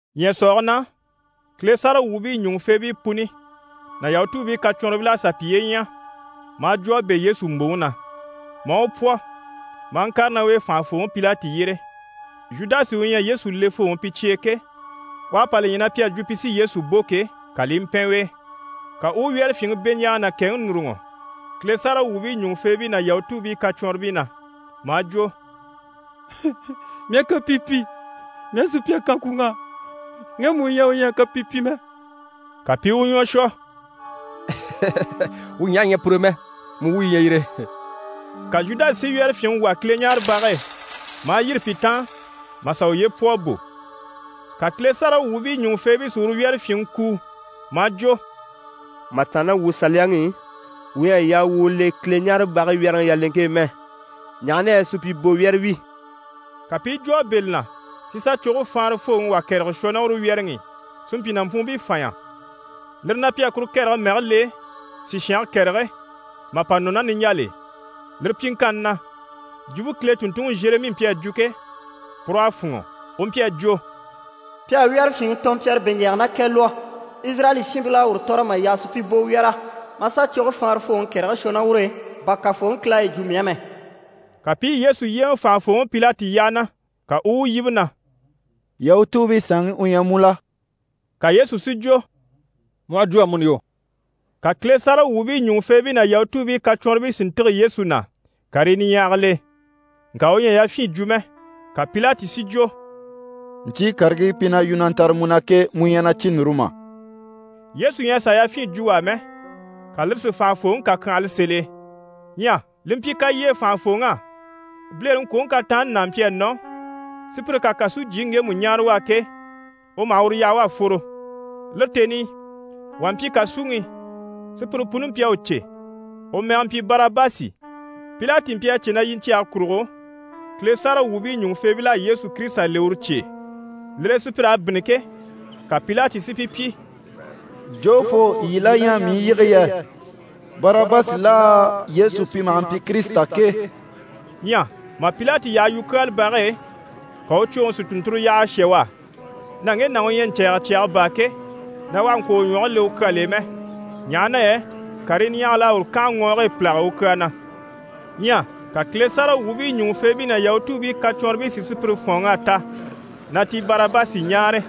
Ɲyɛ̀sɔɔge na, Kile sáragawwuubii ɲùŋufeebii puni ná Yahutuubii kacwɔnribil'à sà piye ɲya, maa jwo a bɛ̂ Yesu mbòŋi na, maa u pwɔ maa ŋkàre ná u e fànhafooŋi Pilati yyére. Zhudasi u ɲyɛ Yesu lefooŋi pi cye e ke, u à pa li ɲya na pi à jwo na pi sí Yesu bò ke, ka li i mpɛn u e, ka u u wyɛ́rɛfyinŋi beɲjaaga ná kɛŋi núruŋɔ Kile sáragawwuubii ɲùŋufeebii ná Yahutuubii kacwɔnribii na, maa jwo: «Mii à kapii pyi, mii à sùpya kan kwùŋ'á, ŋgemu u ɲyɛ u ɲyɛ a kapii pyi mɛ.» Ka pi i u ɲwɔ shwɔ: «Wuu ɲaha ɲyɛ pur'e mɛ, mu wuyo yi ɲyɛ yire.» Ka Zhudasi si wyɛ́rɛfyinŋi wà Kileɲaarebage e, maa yîri pi taan mà sà uye pwɔ a bò. Ka Kile sáragawwuubii ɲùŋufeebii si uru wyɛ́rɛfyinŋi kuu maa jwo: «Mà tàanna ná wuu Saliyaŋi i, wuu ɲyɛ a yaa wuu u le Kileɲaarebage wyɛ́rɛŋi yaleŋke e mɛ, ɲaha na yɛ supyibowyɛrɛ wi.» Ka pi i jwo a bɛ̂ li na si sà coge faanrafooŋi wà kɛrɛge shwɔ ná uru wyɛ́rɛŋi i, si mpyi nàmpwuunbii fanɲya. Lire na, pi à kuru kɛrɛge mɛge le: «Sishange Kɛrɛge» mà pa nɔ ná niɲjal'e. Lire pyiŋkanni na, jwumpe Kile tùnntunŋi Zheremi mpyi a jwo ke, pur'à fûnŋɔ. U mpyi a jwo: «Pi à wyɛ́rɛfyinŋi tɔnmpyara beɲjaaga ná kɛ lwɔ́. Izirayɛli shiinbil'à uru tɔ̀rɔ mà yaha supyibowyɛrɛ, maa sà coge faanrafooŋi kɛrɛge shwɔ ná ur'e, bà Kafooŋi Kile à yi jwo mii á mɛ.» Ka pi i Yesu yyéeŋɛ fànhafooŋi Pilati yyaha na, ka u u u yíbe na: «Yahutuubii saanŋi u ɲyɛ mu la?» Ka Yesu si jwo: «Mu aha jwo amuni yo.» Ka Kile sáragawwuubii ɲùŋufeebii ná Yahutuubii kacwɔnribii si ntîge Yesu na karii niɲyahagil'e, ŋka u ɲyɛ a yafyin jwo mɛ. Ka Pilati si jwo: «Ɲcyii karigii pi na yu na ntare mu na ke, mu ɲyɛ na cyi núru mà?» Yesu ɲyɛ a sàa yafyin jwo u á mɛ, ka lire si fànhafooŋi kakyanhala sèl'e. Ɲyɛ li mpyi kalyee fànhafooŋ'á, bilereŋkwoŋi kataanni n'a mpyi a nɔ, sùpyire ká kàsujyiŋi ŋgemu ɲáare u á ke, u maha uru yaha u à fworo. Lire tèni i, wà mpyi kàsuŋi i, sùpyire puni mpyi a u cè. U mɛge mpyi Barabasi. Pilati mpyi a cè na yiɲcyɛge kurugo, Kile sáragawwuubii ɲùŋufeebil'à Yesu Kirisita le uru cye e. Lire e sùpyir'à bínni ke, ka Pilati si pi pyi: «Jofoo yii la ɲyɛ mii i yige yɛ? Barabasi laa, Yesu pi maha mpyi Kirisita ke?» Ɲyɛ mà Pilati yaha yukyaalabage e, ka u cwoŋi si tùnnturo yaha a shà u á, na ŋge nàŋi u ɲyɛ ɲcɛ̀ɛgɛ cyaga baa ke, na u àha ŋkwɔ̀ u ɲwɔge le u kyal'e mɛ, ɲaha na yɛ karii niɲyahagil'à uru kànha ŋɔɔge e pìlaga u kyaa na. Ɲyɛ ka Kile sáragawwuubii ɲùŋufeebii ná Yahutuubii kacwɔnribii si sùpyire fɔ̀ɔnŋ'a ta na ti Barabasi ɲáare,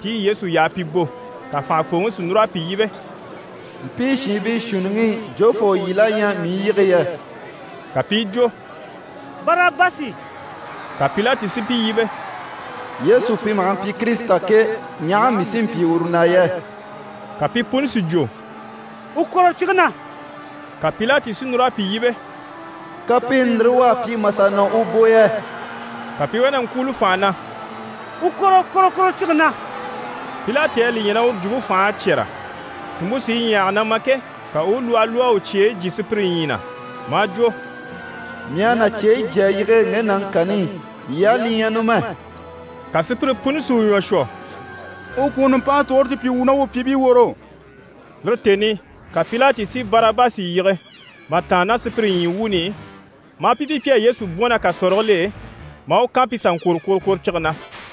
ti i Yesu yaha pi bò. Ka fànhafooŋi si núr'a pi yíbe: «Mpii shiinbii shuunniŋi i, jofoo yii la ɲyɛ mii i yige yɛ?» Ka pi i jwo: «Barabasi!» Ka Pilati si pi yíbe: «Yesu pi maha mpyi Kirisita ke, ɲaha mii sí n‑pyi uru na yɛ?» Ka pi puni si jwo: «U kwòro cige na!» Ka Pilati si núr'a pi yíbe: «Kapiini ndire u à pyi mà sà nɔ u bò yɛ?» Ka pi i wá na ŋkwúuli fànha na: «U kwòro kworokworocige na!» Pilati à li ɲya na uru jwumpe fành'à cyɛ́rɛ, tùnmpe sí i ɲyahage na ma ke, ka u u lwɔhɔ lwɔ́ a u cyeyi jyé sùpyire ɲyii na, maa jwo: «Mii à na cyeyi jyé a yige ŋge nàŋi kani i. Yii á li ɲyɛ numɛ.» Ka sùpyire puni si u ɲwɔ shwɔ: «U kwùŋi nùmpanŋke tugure ti pyi wuu ná wuu pyìibii woro.» Lire tèni i ka Pilati si Barabasi yige mà tàanna ná sùpyire ɲyii wuuni i, maa pi pyi pi à Yesu bwɔ̀n ná kàsɔrigil'e, maa u kan pi sà ŋkwòro kworokworocige na.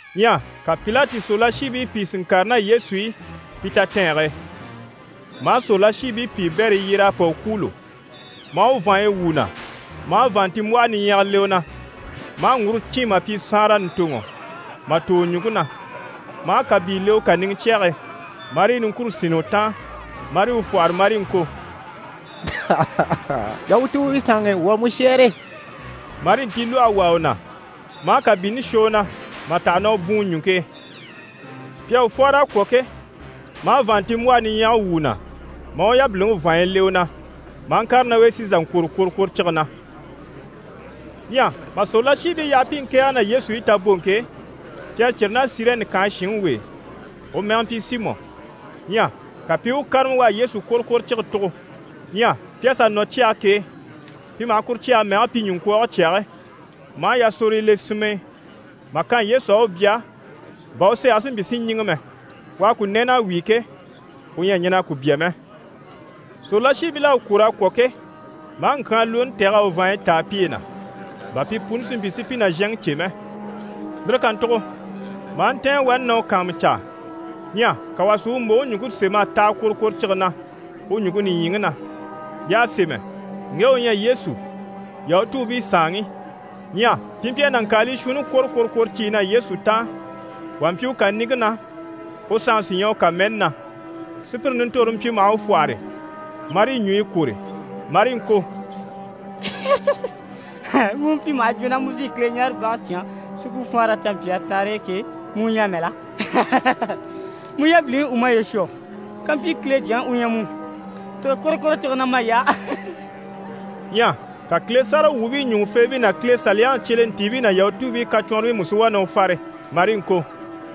Ɲyɛ ka Pilati sòrolashiibii pìi si ŋkàre ná Yesu i pi tatɛɛnge e, maa sòrolashiibii piibɛrii yyér'a pa u kwûulo, maa u vàanɲyi wwû u na, maa vàanntinmbwɔhɔ niɲyɛga le u na, maa ŋguro cîn mà pyi saanra ɲùntoŋɔ mà tò u na, maa kàbii le u kàniŋɛ cyɛge e, marii niŋkure sínni u taan, marii u fwɔ́hɔre marii ŋko: «Yahutuubii Saanŋi, wuu à mu shɛ́ɛre!» Marii ntilwɔhe wàa u na, maa kàbiini shwɔ u na mà taha na u bwùun ɲùŋke e. Pi à u fwɔ́hɔr'a kwɔ̀ ke, maa vàanntinmbwɔhe niɲyɛge wwû u na, maa u yabiliŋi vàanɲyi le u na, maa ŋkàre ná u e si sà ŋkwòro kworokworocige na. Ɲyɛ mà sòrolashiibii yaha pi i ŋkɛ̀ɛge ná Yesu i taboŋke e, pi à círi ná Sirɛni kànhe shinŋi w'e, u mɛge mpyi Simɔ. Ɲyɛ ka pi i u kárama u à Yesu kworokworocige tugo. Ɲyɛ pi à sà nɔ cyage k'e, pi maha kuru cyage mɛge pyi: «Ɲuŋkwɔɔge Cyage» maa yasorogo le sinm'e mà kan Yesu á, u bya bà u sɛɛge si mpyi si ɲíŋɛ mɛ. U à ku nɛ́ɛn'a wíi ke, u ɲyɛ a ɲɛn'a ku bya mɛ. Sòrolashiibil'à u kwòr'a kwɔ̀ ke, maa ŋkyaanlwooni tɛ̀g'a u vàanɲyi táa piye na, bà pi puni si mpyi si pi nàzhanŋi cè mɛ. Lire kàntugo maa ntɛ̀ɛn wani na u kàanmucaa. Ɲyɛ ka wà si u mbòŋi ɲùŋke sém'a taha kworokworocige na u ɲùŋke nìɲyiŋi na. Y'à sémɛ: «ŊGE U ƝYƐ YESU, YAHUTUUBII SAANŊI.» Ɲyɛ pi mpyi a nàŋkaalii shuunni kwòro kworokworociye na Yesu taan. Wà mpyi u kàniŋke na, u sanŋi sí ɲyɛ u kàmɛni na. Sùpyire nintorore mpyi maha u fwɔ́hɔre, marii ɲùɲyi kwòre, marii ŋko: «Mu u mpyi maha jwo na mu sí Kileɲaarebage cyán si ku faanre canmpyaa taanre e ke, mu u ɲyɛ amɛ la? Mu yabiliŋi u maye shwɔ. Kampyi Kile Jyaŋi u ɲyɛ mu, tîge kworokworocige na may'á!» Ɲyɛ ka Kile sáragawwuubii ɲùŋufeebii ná Kile Saliyaŋi cyelentiibii ná Yahutuubii kacwɔnribii mú si wá na u fare marii ŋko: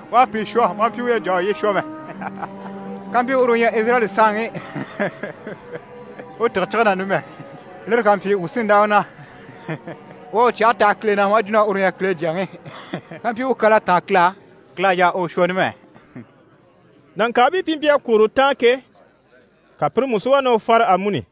«U à pìi shwɔ, maa mpyi u ɲyɛ a jà a uye shwɔ mɛ. Kampyi uru u ɲyɛ Izirayɛli saanŋi, u tîge cige na numɛ, lire ká mpyi, wuu sí n‑dá u na. U à u cyɛge taha Kile na, maa jwo na uru ɲyɛ Kile Jyaŋi. Kampyi u kyal'à táan Kile á, Kile à yaa u u shwɔ numɛ.» Nàŋkaabii pi mpyi a kwòro u taan ke, ka pire mú si wá na u fare amuni.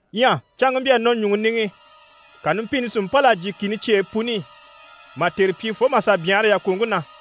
Ɲyɛ canŋke mpyi a nɔ ɲùŋɔ niŋi i, ka numpini si mpâl'a jyè kìni cyeyi puni i, mà tère pyi fo mà sà byanhara yàkoŋke na.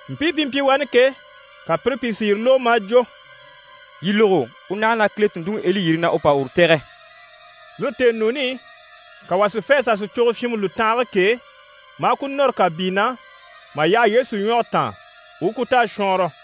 Mpii pi mpyi wani ke, ka pire pìi si yire lógo, maa jwo: «Yii lógo! U naha na Kile tùnntunŋi Eli yiri, na u pa uru tɛ̀gɛ.» Lire tèenuuni i, ka pi wà si fê a sà sìcogo fyinmɛ lùtanhage k'e, maa ku nɔ́rɔ kàbii na, mà yaha Yesu ɲwɔge taan, u u ku ta a shwɔɔnrɔ.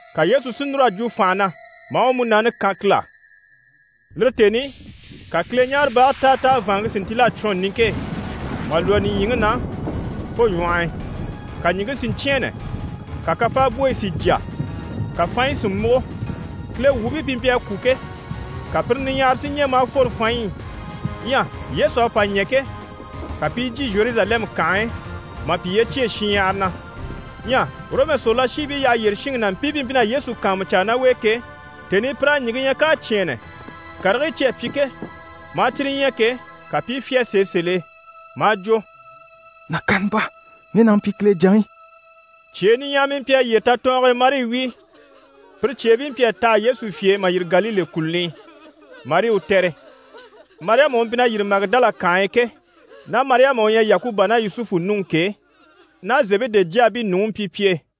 Ka Yesu si núr'a jwo fànha na, maa u múnaani kan Kile á. Lire tèni i, ka Kileɲaarebage táataa vàanŋke si ntíl'a cwɔn niŋke e, mà lwɔ́ nìɲyiŋi na fo ɲwɔh'i. Ka ɲìŋke si ɲcyɛ̂ɛnnɛ, ka kafaabwoyi si jya. Ka fanɲyi si múgo. Kile wuubii pi mpyi a kwû ke, ka pire pìi niɲyahara si ɲɛ̀, maa fworo fanɲyi i. (Ɲyɛ Yesu à pa ɲɛ̀ ke, ka pi i jyè Zheruzalɛmu kànhe e mà piye cyêe shinɲyahara na.) Ɲyɛ Ɔrɔmu sòrolashiibii yyaha yyére shinŋi ná mpii pi mpyi na Yesu kàanmucaa ná u e ke, tèni i pir'à ɲìŋke ɲya k'à cyɛ̂ɛnnɛ, karigii cyi à pyi ke, maa cyire ɲya ke, ka pi i fyá sèe sèl'e, maa jwo: «Nàkaana baa, ŋge nàŋi mpyi Kile Jyaŋi.» Cyee niɲyahamii mpyi a yyére tatɔɔnge e marii wíi. Pire cyeebii mpyi a taha Yesu fye e mà yîri Galile kùluni i, marii u tɛ̀re. Mariyama u mpyi na yîri Magidala kànhe e ke, ná Mariyama u ɲyɛ Yakuba ná Yusufu nuŋi ke, ná Zebede jyaabii nuŋi mpyi pi e.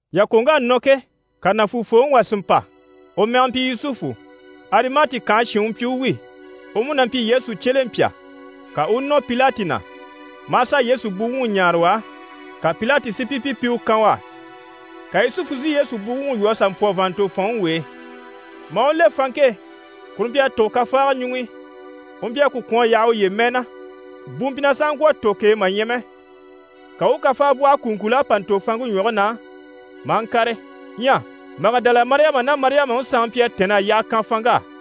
Yàkoŋk'à nɔ ke, ka nàfuufooŋi wà si mpa, u mɛge mpyi Yusufu, Arimati kànhe shin u mpyi u wi. U mú na mpyi Yesu cyelempya. Ka u u nɔ Pilati na, maa sà Yesu buwuŋi ɲáare u á. Ka Pilati si pi pyi pi u kan u á. Ka Yusufu si Yesu buwuŋi lwɔ́ a sà mpwɔ vàanntofɔnŋi w'e, maa u le fanŋke e, kuru mpyi a tùgo kafaaga ɲuŋ'i, u mpyi a ku kwɔ̀n a yaha uye mɛɛ na, bu mpyi na sàha ŋkwɔ̀ a tò k'e mà ɲya mɛ. Ka u u kafaabwɔhɔ kùuŋkul'a pa ntò fanŋke ɲwɔge na, maa ŋkàre. Ɲyɛ Magidala Mariyama ná Mariyamaŋi sanŋi mpyi a tɛ̀nn'a yyaha kan fanŋk'á.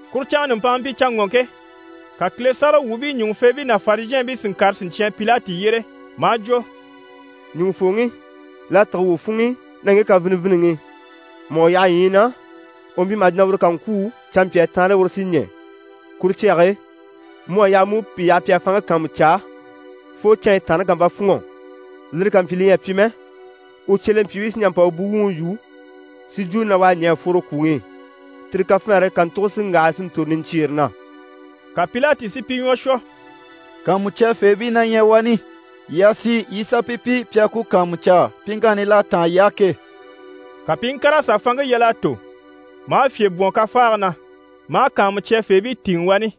Kuru canŋa nùmpanŋa mpyi canŋɔŋke, ka Kile sáragawwuubii ɲùŋufeebii ná Farizhɛɛnbii si ŋkàre siɲcyan Pilati yyére maa jwo: «Ɲùŋufooŋi, l'à tîge wuu funŋ'i na ŋge kafiniviniŋi, mà u yaha ɲyii na, u mpyi maha jwo uru ká ŋkwû, canmpyaa taanre uru sí ɲɛ̀. Kuru cyage e, mu à yaa mu u pìi yaha pi a fanŋke kàanmucaa fo canɲyi taanreŋi ká mpa fûnŋɔ. Lire ká mpyi li ɲyɛ a pyi mɛ, u cyelempyiibii sí n‑jà n‑pa u buŋi yû, si jwo na u à ɲɛ̀ a fworo kwùŋi i. Tire kafinare kàntuge sí n‑waha si ntòro niɲcyiire na.» Ka Pilati si pi ɲwɔ shwɔ: «Kàanmucyafeebii na ɲyɛ wani, yii a sì, yii i sà pi pyi, pi a ku kàanmucaa pyiŋkanni l'à táan yii á ke.» Ka pi i ŋkàr'a sà fanŋke yal'a tò, maa fyè bwɔ̀n kafaage na, maa kàanmucyafeebii tìŋɛ wani.